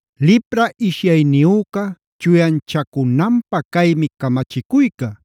“Lipra ishyayniyüca chuyanchacunanpä caymi camachicuyca.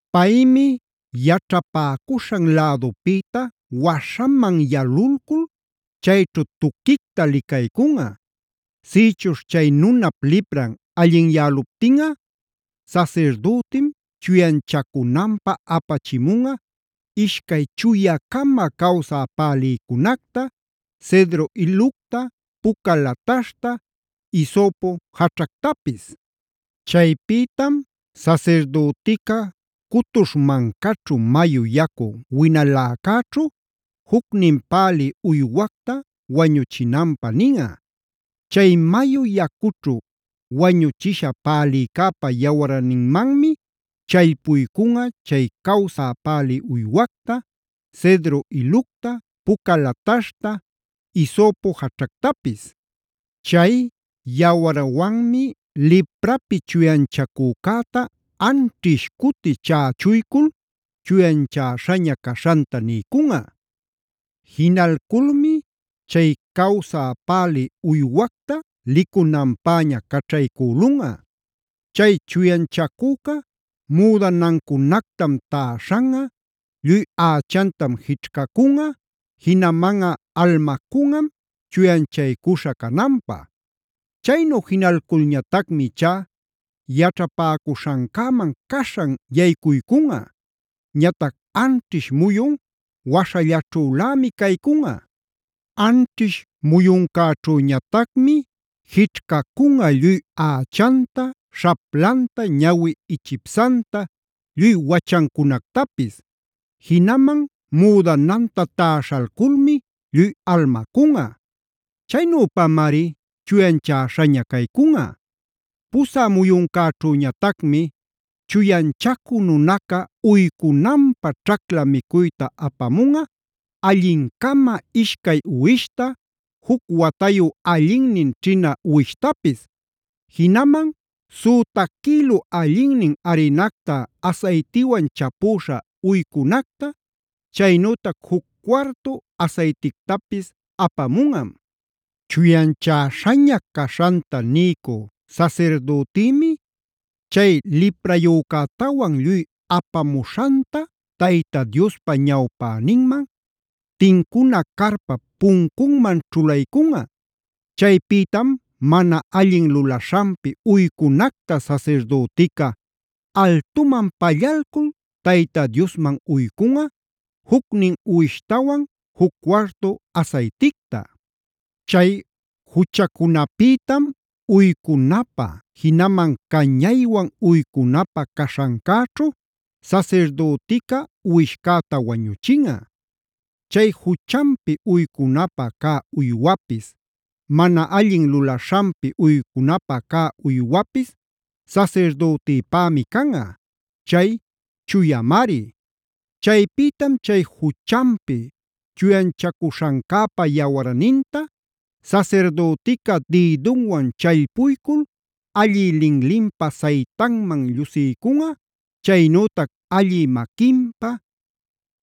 Paymi yaćhapäcuśhan lädupïta waśhaman yalulcul chayćhu tuquicta licaycunꞌa. Sïchuśh chay nunap lipran allinyäluptinꞌa, sasirdütim chuyanchacunanpä apachimunꞌa ishcay chuya-cama cawsä pälïcunacta, cedro ilucta, puca lataśhta, hisopo jaćhactapis. Chaypïtam sasirdütica cutuśh mancaćhu mayu yacu winaläcäćhu jucnin pälï uywacta wañuchinanpä ninꞌa. Chay mayu yacućhu wañuchishä pälïcäpa yawarninmanmi challpuycunꞌa chay cawsä pälï uywacta, cedro ilucta, puca lataśhta, hisopo jaćhactapis. Chay yawarwanmi liprapi chuyanchacücäta anćhish cuti chächuycul chuyanchäśhaña caśhanta niycunꞌa. Jinalculmi chay cawsä pälï uywacta licunanpäña caćhaycülunꞌa. “Chay chuyanchacüca müdanancunactam täśhanꞌa, lluy ächantam jićhcacunꞌa, jinamanꞌa almacunꞌam chuyanchaycuśha cananpä. Chaynu jinalculñatacmi ichá yaćhapäcuśhancäman caśhan yaycuycunꞌa. Ñatac anćhish muyun waśhallaćhülämi caycunꞌa. Anćhish muyuncäćhüñatacmi jićhcacunꞌa lluy ächanta, śhaplanta, ñawi ichipsanta, lluy wachancunactapis. Jinaman müdananta täśhalculmi lluy almacunꞌa. Chaynüpamari chuyanchäśhaña caycunꞌa. Pusä muyuncäćhüñatacmi chuyanchacü nunaca uycunanpä ćhacla micuyta apamunꞌa allin-cama ishcay uwishta, juc watayu allinnin ćhina uwishtapis. Jinaman süta quïlu allinnin arinacta asaytiwan chapüśha uycunacta, chaynütac juc cuartu asaytictapis apamunꞌa. Chuyanchäśhaña caśhanta niycü sasirdütïmi chay liprayücätawan lluy apamuśhanta Tayta Diospa ñawpäninman, tincuna carpap puncunman ćhulaycunꞌa. Chaypïtam mana allin lulaśhanpi uycunacta sasirdütica altuman pallalcul Tayta Diosman uycunꞌa jucnin uwishtawan juc cuartu asayticta. Chay juchacunapïtam uycunapä, jinaman cañaywan uycunapä caśhancäćhu sasirdütica uwishcäta wañuchinꞌa. Chay juchanpi uycunapä cä uywapis, mana allin lulaśhanpi uycunapä cä uywapis sasirdütipämi canꞌa; chay chuyamari. “Chaypïtam chay juchanpi chuyanchacuśhancäpa yawarninta sasirdütica dïdunwan challpuycul allï linlinpa saytanman llusiycunꞌa, chaynütac allï maquinpa,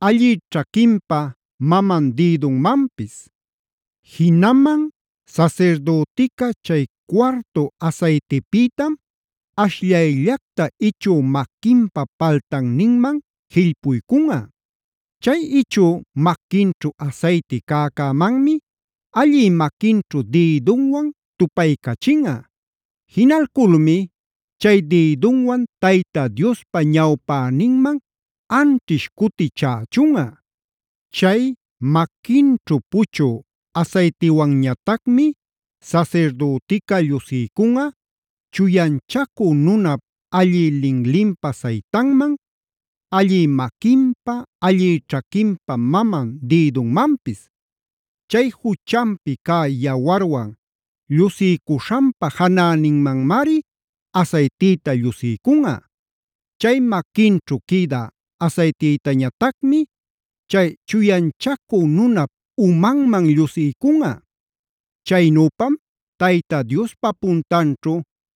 allï ćhaquinpa maman dïdunmanpis. Jinaman sasirdütica chay cuartu asaytipïtam ashllayllacta ichü maquinpä paltanninman jillpuycunꞌa. Chay ichü maquinćhu asayti cäcämanmi allï maquinćhu dïdunwan tupaycachinꞌa. Jinalculmi chay dïdunwan Tayta Diospa ñawpäninman anćhish cuti chächunꞌa. Chay maquinćhu puchü asaytiwanñatacmi sasirdütica llusiycunꞌa chuyanchacü nunap allï linlinpa saytanman, allï maquinpa, allï ćhaquinpa maman dïdunmanpis; chay juchanpi cä yawarwan llusïcuśhanpa janäninmanmari asaytïta llusiycunꞌa. Chay maquinćhu quïda asaytïtañatacmi chay chuyanchacü nunap umanman llusiycunꞌa. Chaynüpam Tayta Diospa puntanćhu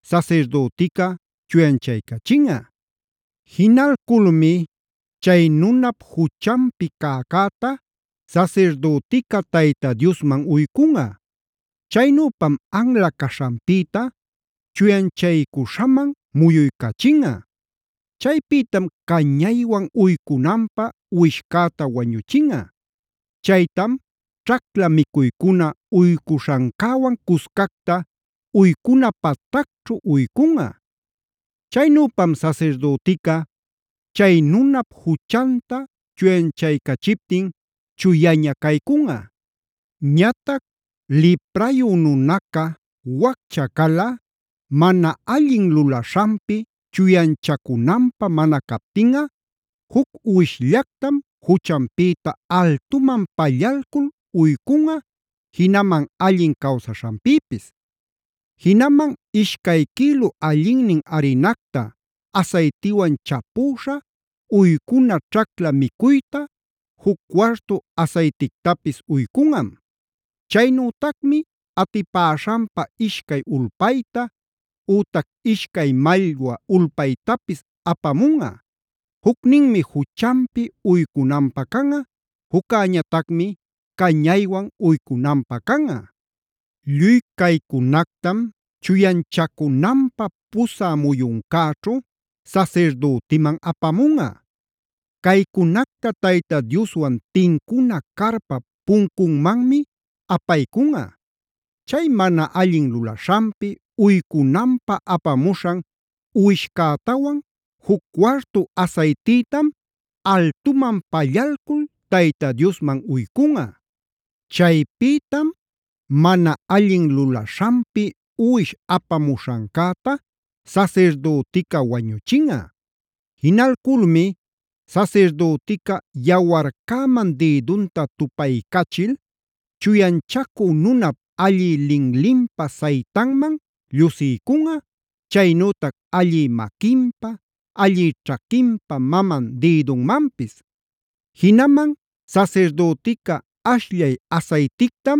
sasirdütica chuyanchaycachinꞌa. Jinalculmi chay nunap juchanpi cäcäta sasirdütica Tayta Diosmam uycunꞌa; chaynüpam anla caśhanpïta chuyanchaycuśhaman muyuycachinꞌa. Chaypïtam cañaywan uycunanpä uwishcäta wañuchinꞌa. Chaytam ćhacla micuycuna uycuśhancäwan cuscacta uycuna patacćhu uycunꞌa. Chaynüpam sasirdütica chay nunap juchanta chuyanchaycachiptin chuyaña caycunꞌa. “Ñatac liprayu nunaca waccha calꞌa mana allin lulaśhanpi chuyanchacunanpä mana captinꞌa juc uwishllactam juchanpïta altuman pallalcul uycunꞌa, jinaman allin cawsaśhanpïpis. Jinaman ishcay quïlu allinnin arinacta asaytiwan chapüśha uycuna ćhacla micuytam, juc cuartu asaytictapis uycunꞌa. Chaynütacmi atipäśhanpa ishcay ulpayta, ütac ishcay mallwa ulpaytapis apamunꞌa. Jucninmi juchanpi uycunanpä canꞌa, juccäñatacmi cañaywan uycunanpä canꞌa. Lluy caycunactam chuyanchacunanpä pusä muyuncäćhu sasirdütiman apamunꞌa; caycunacta Tayta Dioswan tincuna carpap puncunmanmi apaycunꞌa. Chay mana allin lulaśhanpi uycunanpä apamuśhan uwishcätawan juc cuartu asaytïtam altuman pallalcul Tayta Diosman uycunꞌa. Chaypïtam mana allin lulaśhanpi uwish apamuśhancäta sasirdütica wañuchinꞌa. Jinalculmi sasirdütica yawarcäman dïdunta tupaycachil chuyanchacü nunap allï linlinpa saytanman llusiycunꞌa, chaynütac allï maquinpa, allï ćhaquinpa maman dïdunmanpis. Jinaman sasirdütica ashllay asaytictam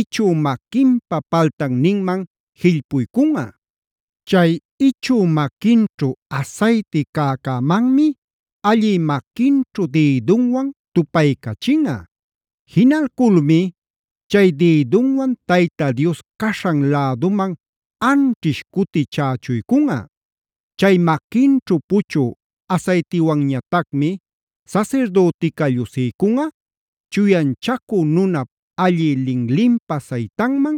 ichü maquinpa paltanninman jillpuycunꞌa. Chay ichü maquinćhu asayti cäcämanmi allï maquinćhu dïdunwan tupaycachinꞌa. Jinalculmi chay dïdunwan Tayta Dios caśhan läduman anćhish cuti chächuycunꞌa. Chay maquinćhu puchü asaytiwanñatacmi sasirdütica llusiycunꞌa chuyanchacü nunap allï linlinpa saytanman,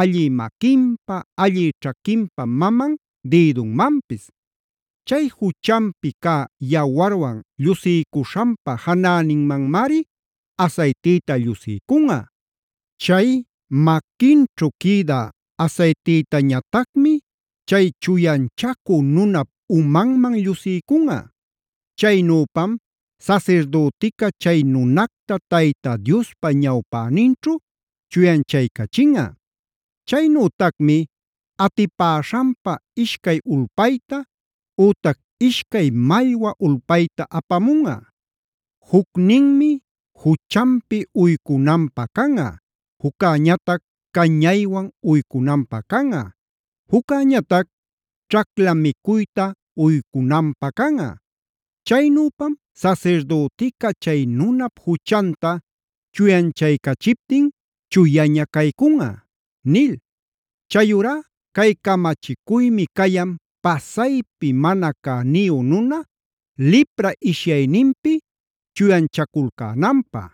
allï maquinpa, allï ćhaquinpa manam dïdunmanpis; chay juchanpi cä yawarwan llusiycuśhanpä janäninmanmari asaytïta llusiycunꞌa. Chay maquinćhu quïda asaytïtañatacmi chay chuyanchacü nunap umanman llusiycunꞌa. Chaynüpam sasirdütica chay nunacta Tayta Diospa ñawpäninćhu chuyanchaycachinꞌa. Chaynütacmi atipäśhanpa ishcay ulpayta, ütac ishcay mallwa ulpayta apamunꞌa. Jucninmi juchanpi uycunanpä canꞌa, juccäñatac cañaywan uycunanpä canꞌa, juccäñatac ćhacla micuyta uycunanpä canꞌa. Chaynüpam sasirdütica chay nunap juchanta chuyanchaycachiptin chuyaña caycunꞌa” nil. Chayurá cay camachicuymi cayan pasaypi mana cäniyu nuna lipra ishyayninpi chuyanchaculcänanpä.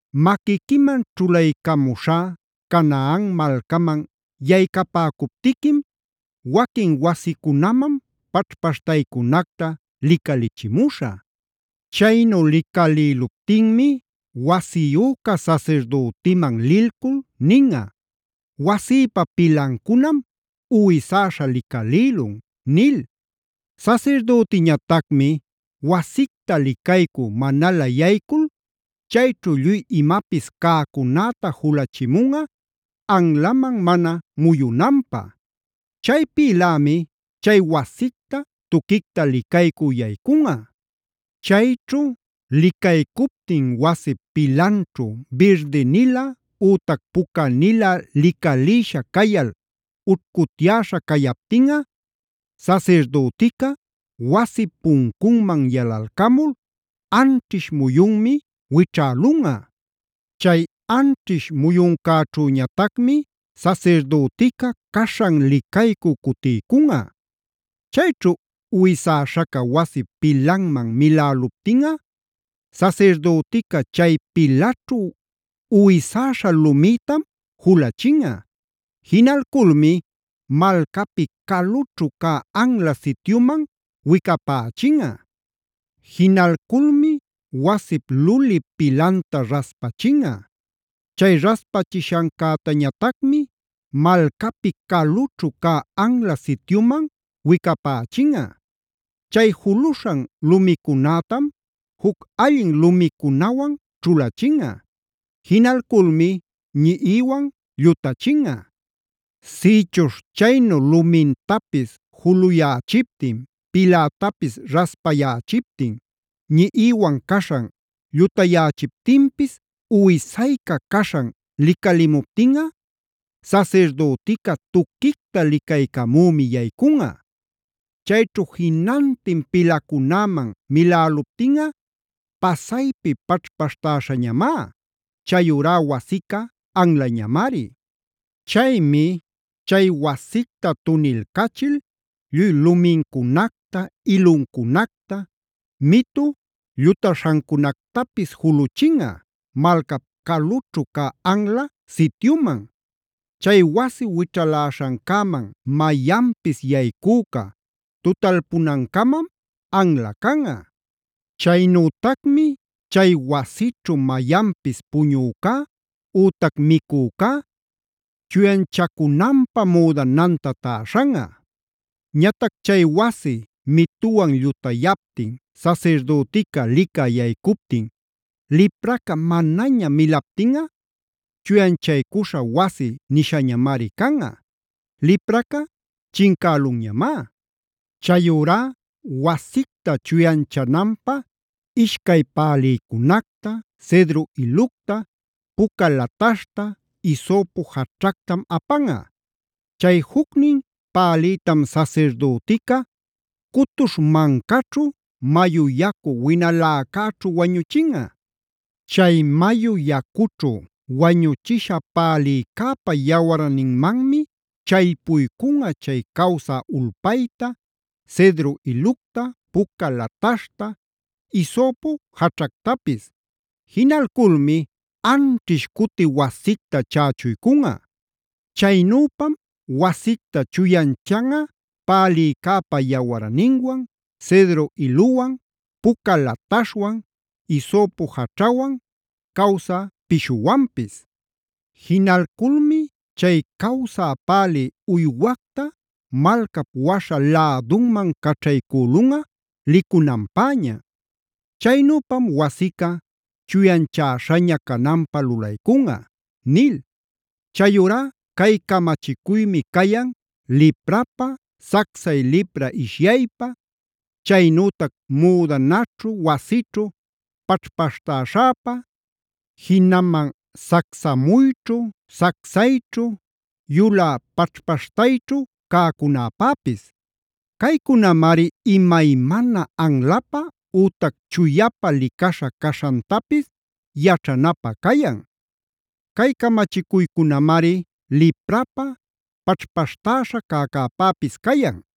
“Maquiquiman ćhulaycamuśhá Canaan malcaman yaycapäcuptiquim waquin wasicunaman paćhpaśhtaycunacta licalichimuśhä. Chaynu licalïluptinmi wasiyüca sasirdütiman lilcul ninꞌa: ‘Wasïpa pilancunam uwisäśha licalïlun’ nil. “Sasirdütiñatacmi wasicta licaycü manalä yaycul chayćhu lluy imapis cäcunäta julachimunꞌa, anlaman mana muyunanpä. Chaypïlämi chay wasicta tuquicta licaycü yaycunꞌa. “Chayćhu licaycuptin wasip pilanćhu birdi-nilä ütac pucanilä licalïsha cayal ućhcutyäśha cayaptinꞌa, sasirdütica wasip puncunman yalalcamul anćhish muyunmi wićhälunꞌa. Chay anćhish muyuncäćhüñatacmi sasirdütica caśhan licaycü cutiycunꞌa. Chayćhu uwisäśhaca wasip pilanman miläluptinꞌa, sasirdütica chay pilaćhu uwisäśha lumïtam julachinꞌa. Jinalculmi malcapi calućhu cä anla sityuman wicapächinꞌa. Jinalculmi wasip luli pilanta raspachinꞌa. Chay raspachishancätañatacmi malcapi calućhu cä anla sityuman wicapächinꞌa. Chay juluśhan lumicunätam juc allin lumicunawan ćhulachinꞌa. Jinalculmi ñiꞌiwan llutachinꞌa. “Sïchuśh chaynu lumintapis juluyächiptin, pilätapis raspayächiptin, ñiꞌiwan caśhan llutayächiptinpis uwisayca caśhan licalimuptinꞌa, sasirdütica tuquicta licaycamümi yaycunꞌa. Chayćhu jinantin pilacunäman miläluptinꞌa pasaypi paćhpaśhtäśhañamá; chayurá wasica anlañamari. Chaymi chay wasicta tunilcachil lluy lumincunacta, iluncunacta, mitu llutaśhancunactapis juluchinꞌa malcap calućhu cä anla sityuman. Chay wasi wićhaläśhancäman mayanpis yaycüca tutalpünancamam anla canꞌa. Chaynütacmi chay wasićhu mayanpis puñücá ütac micücá chuyanchacunanpä müdananta täśhanꞌa. “Ñatac chay wasi mituwan llutayaptin sasirdütica licä yaycuycuptin lipraca manaña milaptinꞌa chuyanchaycuśha wasi nishañamari canꞌa; lipraca chincälunñamá. Chayurá wasicta chuyanchananpä ishcay pälïcunacta, cedro ilucta, puca lataśhta, hisopo jaćhactam apanꞌa. Chay jucnin pälïtam sasirdütica cutuśh mancaćhu mayu yacu winaläcäćhu wañuchinꞌa. Chay mayu yacućhu wañuchisha pälïcäpa yawarninmanmi challpuycunꞌa chay cawsä ulpayta, cedro ilucta, puca lataśhta, hisopo jaćhactapis. Jinalculmi anćhish cuti wasicta chächunꞌa. Chaynüpam wasicta chuyanchanꞌa pälïcäpa yawarninwan, cedro iluwan, puca lataśhwan, hisopo jaćhawan, cawsä pishuwanpis. Jinalculmi chay cawsä pälï uywacta malcap waśha lädunman caćhaycülunꞌa licunanpäña. Chaynüpam wasica chuyanchäśhaña cananpä lulaycunꞌa” nil. Chayurá cay camachicuymi cayan liprapä, sacsay lipra ishyaypä, chaynütac müdanaćhu, wasićhu paćhpaśhtäśhapä, jinaman sacsamuyćhu, sacsayćhu, yulä paćhpaśhtayćhu cäcunäpäpis. Caycunamari imaymana anlapä ütac chuyapä licaśha caśhantapis yaćhanapä cayan. Cay camachicuycunamari liprapä, paćhpaśhtäśha cäcäpäpis cayan.